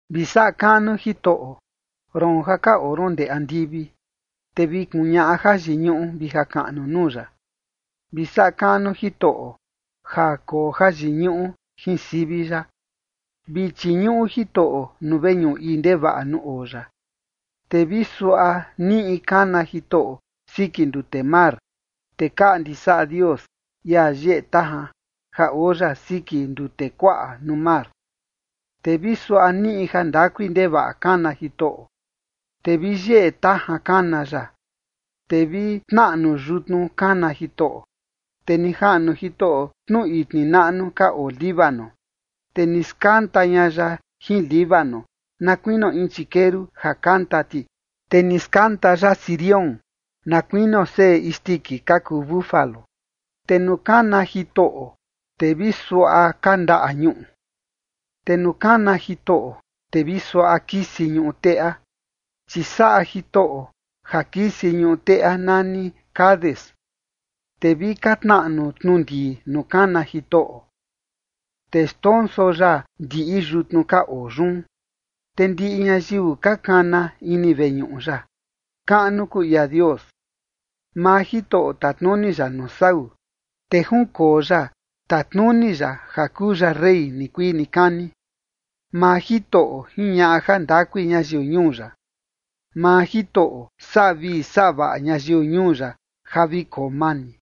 Vi saꞌa kaꞌnu Jitoꞌo, roon ja ka oo ron ndee andivi, te vi kuñaꞌa jayiñuꞌu vi jakaꞌnu nuu ya. Vi saꞌa kaꞌnu Jitoꞌo ja koo jayiñuꞌu jin sivi ya. Vi chiñuꞌu Jitoꞌo nuu veñuꞌu ii ndevaꞌa nuu oo ya. Te vi suaꞌa niꞌi kana Jitoꞌo siki ndute mar, te kaꞌndi saꞌa Dios, ia yeꞌe tajan ja oo ya siki ndute kuaꞌa nuu mar. Te vi suaꞌa niꞌi jandakui ndevaꞌa kana Jitoꞌo, te vi yeꞌe tajan kana ya. Te vi tnaꞌnu yutnu kana Jitoꞌo, te ni jaꞌnu Jitoꞌo tnu itni naꞌnu ka oo Líbano. Te ni skanta ña ya jin Líbano na kuinio in chikeru ja kanta ti, te ni skanta ya Sirión na kuinio seꞌe isndiki ka kuu búfalo. Te nuu kana Jitoꞌo, te vi suaꞌa kandaꞌa ñuꞌu. Te nuu kana Jitoꞌo, te vi suaꞌa kisi ñuꞌu teꞌa, chi saꞌa Jitoꞌo ja kisi ñuꞌu teꞌa nani Cades. Te vi ka tnaꞌnu tnu ndii nuu kana Jitoꞌo, te xndonso ya ndiꞌi yutnu ka oo yun. Te ndiꞌi ñayiu ka kana ini veñuꞌu ya: “Kaꞌnu kuu ia Dios”. Maa Jitoꞌo tatnuni ya nuu sau, te junkoo ya tatnuni ya ja kuu ya rey nikuii nikani. Maa Jitoꞌo jiñaꞌa jandakui ñayiu ñuu ya. Maa Jitoꞌo saꞌa vii saꞌa vaꞌa ñayiu ñuu ya ja vi koo mani.